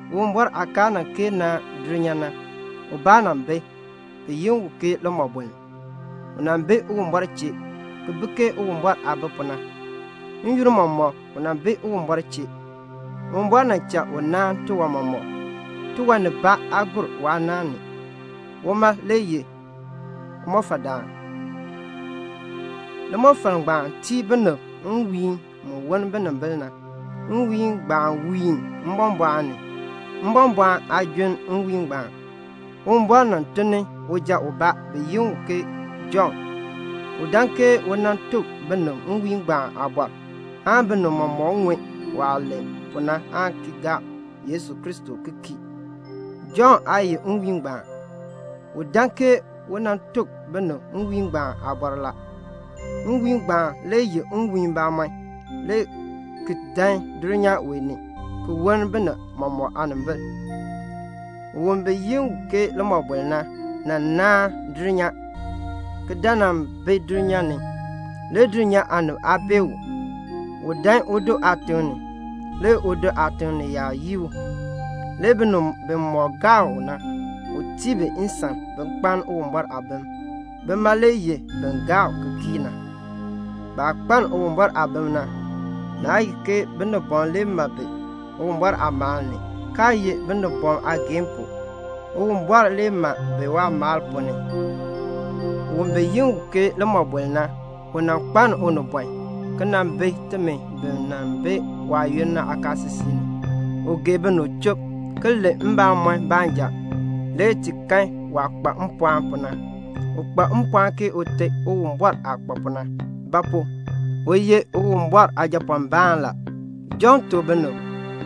Uwumbɔr aah kaa nan kee naan dulnyaa na, ubaa nan bi, bi yi u ke Iliin. U nan bi Uwumbɔr chee, ki bi ke Uwumbɔr aah bi pu na. N-yoonn mɔmɔk u nan bi Uwumbɔr chee. Uwumbɔr nan cha u naan tiwan mɔmɔk. Tiwan nibaa aa gur waa naan ni. Uma le ye limɔfaldaan. Limɔfal ngbaan tii binib nwiihn mu woln binimbil na. Nwiihn ngbaan wiini mbɔmbɔɔn ni. Mbɔmbɔɔn aa junn nwiihn ngbaan. Uwumbɔr nan tun ni uja ubaa, bi yi u Jɔnn. U dan ke u nan tuk binib nwiihn ngbaan aabɔr, aan binib mɔmɔk ŋun waah len pu na aan ki gaa Yesu Kristo ki kii. Jɔnn aa ye nwiihn ngbaan. U dan ke u nan tuk binib nwiihn ngbaan aabɔr la. Nwiihn ngbaan le ye nwiihn bamɔnn, le ki dan dulnyaa wee ni ki woln binib mɔmɔk aanimbil. Un bi yi u ke Iliin na, nan naan dulnyaa, ki dan nan bi dulnyaa ni; le dulnyaa aanib aa bee u. U dan udo aatiŋ ni. Le udo aatiŋ ni yaab yii u. Le binib bimɔk gaa u na, u tii bi nsan bin kpaln Uwumbɔr aabim. Bima le ye bin gaa u ki kii na. Baah kpaln Uwumbɔr aabim na, naa ye ke binibɔm le ma bi Uwumbɔr aamaal ni, kaa ye binibɔm aageehn pu. Uwumbɔr le ma bi waamaal ponn ni. Un bi yi u ke Iliin na, u nan kpaln unibɔn, ki nan bi timi bi nan bi waayoonn na aakaasisik ni. U gee binib chub, ki len mbamɔn baanja. Le ti kan waah kpa mpɔɔn pu na. U kpa mpɔɔn ke Ute Uwumbɔr aah kpa pu na; ba pu? u ye Uwumbɔr Aajapɔɔnbaan la. Jɔnn tuk binib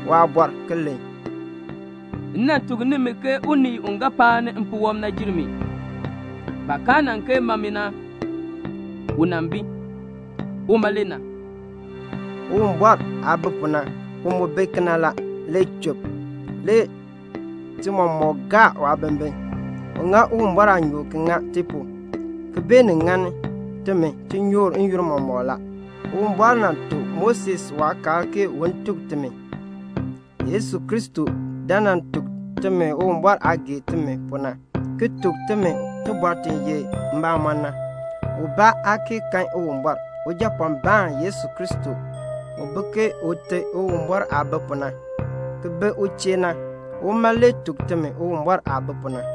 waabɔr, ki len, "M nan tuk nimi ke unii u ga paani mpuwɔb na jer mi; baah kaa nan kee ma mi na, u nan bi. Uma le na." Uwumbɔr aah bi pu na, u mu bi kena la, le chub. Le ti mɔmɔk gaa waabimbin. U ŋa Uwumbɔr aanyoor ki ŋa ti pu, ki beenin ŋani timi tinyoor n-yoonn mɔmɔk la. Uwumbɔr nan tuk Moses waakaal ke un tuk timi. Yesu Kristo dan nan tuk timi Uwumbɔr aah gee timi pu na, ki tuk timi tibɔr ti ye mbamɔn na. Ubaa aa kee kan Uwumbɔr. Ujapɔɔnbaan Yesu Kristo, u bi ke Ute Uwumbɔr aah bi pu na, ki bi u chee na, uma le tuk timi Uwumbɔr aah bi pu na.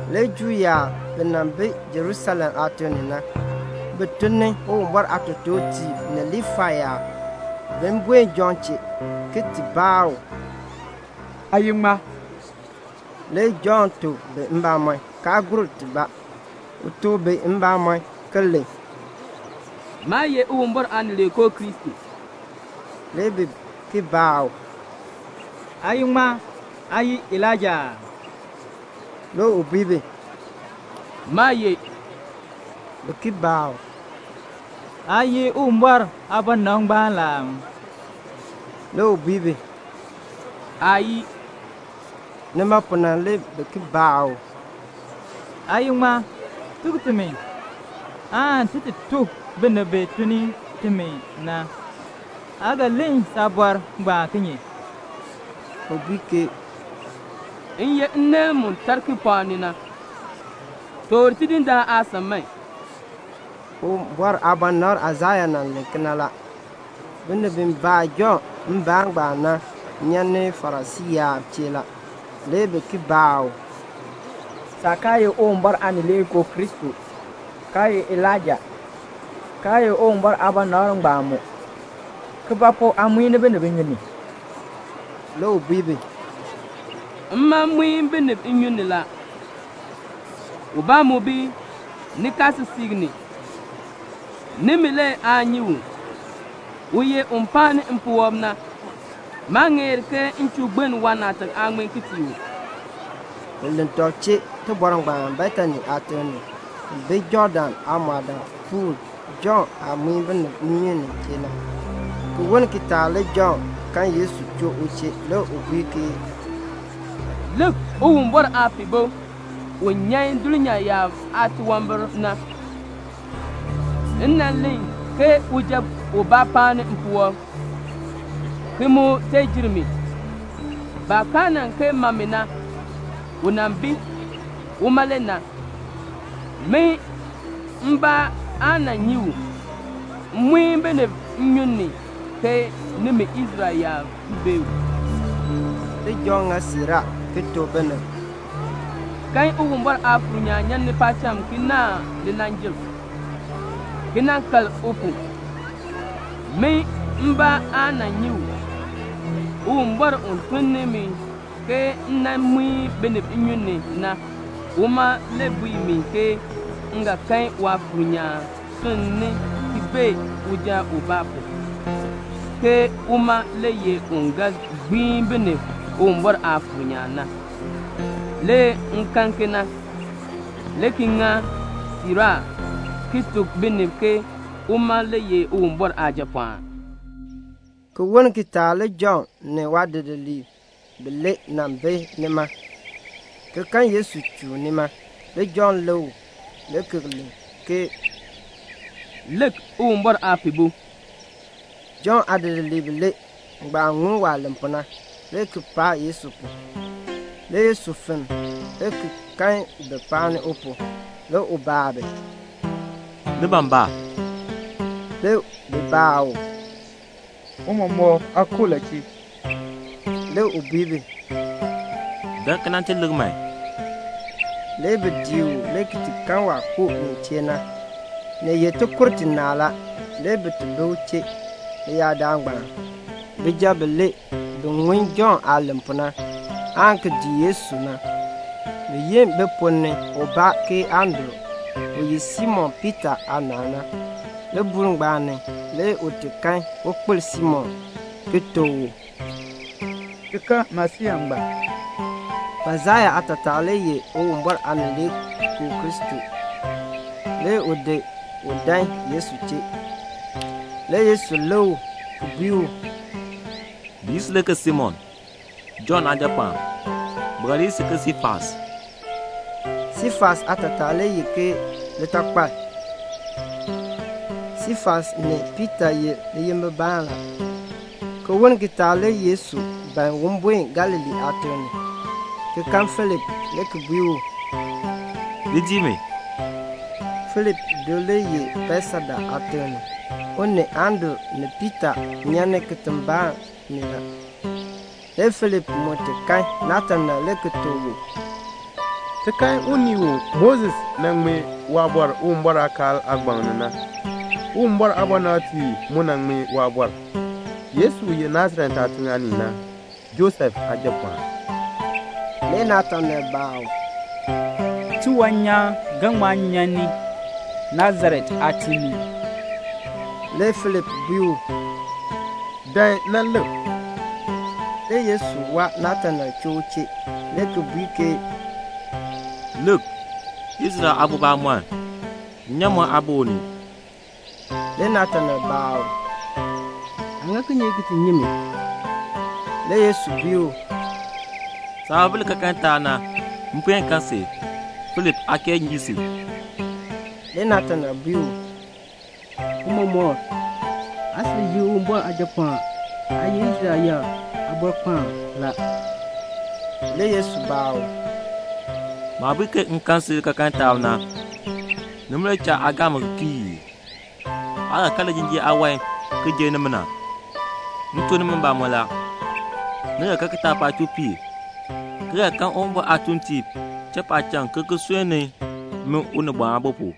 Le Juu yaab bi nan bi Jerusalem aatiŋ ni na, bi tun ni Uwumbɔr aatotoortiib ni Liifai yaab bin buen Jɔnn chee, ki ti baa u, "Aa ye ŋmaa?" Le Jɔnn tuk bi mbamɔn, kaa gur tibaa. U tuk bi mbamɔn, ki len, "Maa ye Uwumbɔr Aanileekoo Kristo." Le bi ki baa u, "Aa ye ŋmaa? Aa ye Elaija aa?" Le u bui bi, "Maa ye." Bi ki baa u, "Aa ye Uwumbɔr aabɔnabr ngbaan la aa?" Le u bui bi, "Aayii." Nima pu na le bi ki baa u, "Aa ye ŋmaa? Tuk timi, aan ti ti tuk binib bi tun ni timi na. Aa ga len saabɔr ngbaan kinye?" U bui ke "M ye nneel mu tar kipɔɔk ni na: 'Toor Tidindaan aasan man."' Uwumbɔr aabɔnabr Aisaya nan len kena la. Binib bi baa Jɔnn mbaan ngbaan na nyan ni Farisii yaab chee la. Le bi ki baa u, "Saah kaa ye Uwumbɔr Aanileekoo Kristo, kaa ye Elaija, kaa ye Uwumbɔr aabɔnabr ngbaan mu, ke ba pu aa muin binib nnyun ni?" Le u bui bi, "Mma muin binib nnyun ni la. Ubaa mu bi nikaasisik ni. Nimi le aa nyi u. U ye un paani mpuwɔb na. Maa ŋeer ke m chuu gbiln waanaatak aaŋmin ki tii u." Bi len tɔb chee tibɔr ngbaan Betani aatiŋ ni, ki bi Jɔɔdan aamɔɔdaapuul, Jɔnn aah muin binib nnyun ni nin chee na. Ki woln kitaak le Jɔnn kan Yesu choo u chee, le u bui ke "Lik, Uwumbɔr Aapihbo u di dulnyaa yaab aatunwambir ki di nyan na. M nan len ke uja ubaa paani mpuwɔb ki mu tee jer mi; baah kaa nan kee ma mi na, u nan bi. Uma le na. Min mbaa aa nan nyi u; m muin binib nnyun ni ke nimi Israel yaab bee u." Le Jɔnn ŋa siiraa ki tuk binib, "M kan Uwumbɔr Aafuur nyaan nyan ni paacham ki naahn linanjil, ki nan kal u pu. Min mbaa aa nan nyi u; Uwumbɔr u tun ni mi ke m nan muin binib nnyun ni na, uma le bui mi ke m ga kan Waafuur nyaan sunni ki bee uja ubaa pu, ke uma le ye un ga gbiin binib Uwumbɔr Aafuur nyaan na. Le m kan kena, le ki ŋa siiraa ki tuk binib ke uma le ye Uwumbɔr Aajapɔɔn." Ki woln kitaak le Jɔnn ni waadidiliib bilee nan bi nima, ki kan Yesu chuun nima. Le Jɔnn lik u, le ki len ke "Lik, Uwumbɔr Aapihbo." Jɔnn aadidiliib bilee ngbaan ŋun waah len pu na, le ki paa Yesu pu. Le Yesu fenn, le ki kan bi paani u pu. Le u baa bi, "Ni ban ba?" Le bi baa u, "Tiicha, aa koo la chee?" Le u bui bi, "Dan man ki ti lik man." Le bi dii u le ki ti kan waah koo nin chee na. Ni ye tikur tinaa la. Le bi ti bi u chee leyaadaal ngbaan. Bijab bilee bi ŋun Jɔnn aah len pu na, aan ki dii Yesu na, bi yi bi ponn ni ubaa ke Andru, u ye Simon Piita aanaal na. Libuul ngbaan ni le u ti kan ukpil Simon, ki tuk u, "Ti kan Masiya ngbaan." (Masiya aatataa le ye Uwumbɔr Aanileekoo Kristo.) Le u di u dan Yesu chee. Le Yesu lik u, ki bui u, "Bi yi si le ke Simon, Jɔnn aajapɔɔn. Bi ga li yi si ke Siifas." (Siifas aatataa le ye ke litakpal. Siifas ni Piita ye liyimbibaan la.) Ki woln kitaak le Yesu ban un buen Galilee aatiŋ ni, ki kan Filip, le ki bui u, "Li dii mi." Filip do le ye Betseda aatiŋ ni. U ni Andru ni Piita nyan ni kitiŋ kibaa ni la. Le Filip mu ti kan Natanael le ki tuk u, "Ti kan unii u Moses nan ŋmee waabɔr Uwumbɔr aakaal aagbaŋ ni na, Uwumbɔr aabɔnabtiib mu nan ŋmee waabɔr, Yesu u ye Nasaret aatiŋ aanii na, Josef aajapɔɔn." Le Natanael baa u, "Tiwan nyaan ga ŋma nyan ni Nasaret aatiŋ ni ii?" Le Filip bui u, "Dan nan lik." Le Yesu waa Natanael choo u chee, le ki bui ke "Lik, Israel aabo bamɔnn. Nnyaamɔn aa bi u ni." Le Natanael baa u, "Aa ŋa kinye ki ti nyi mi?" Le Yesu bui u, "Saah ba bi likaakaln taab na, m puen kan si, Filip aa kee yin si." Le Natanael bui u, "Tiicha, aa sil ye Uwumbɔr Aajapɔɔn. Aa ye Israel yaab Aabɔrkpaan la." Le Yesu baa u, "Maah bui ke m kan si likaakaln taab na, nima le cha aa gaa mi ki kii ii? Aa ga kan lijinjiir aawan ki jer nimina. M tuk nimi mbamɔn la, ni ga kan kitaapaak chuu piir, ki ga kan Uwumbɔr aatuuntiib cha paacham ki ki sunni min Unibɔn Aabo pu."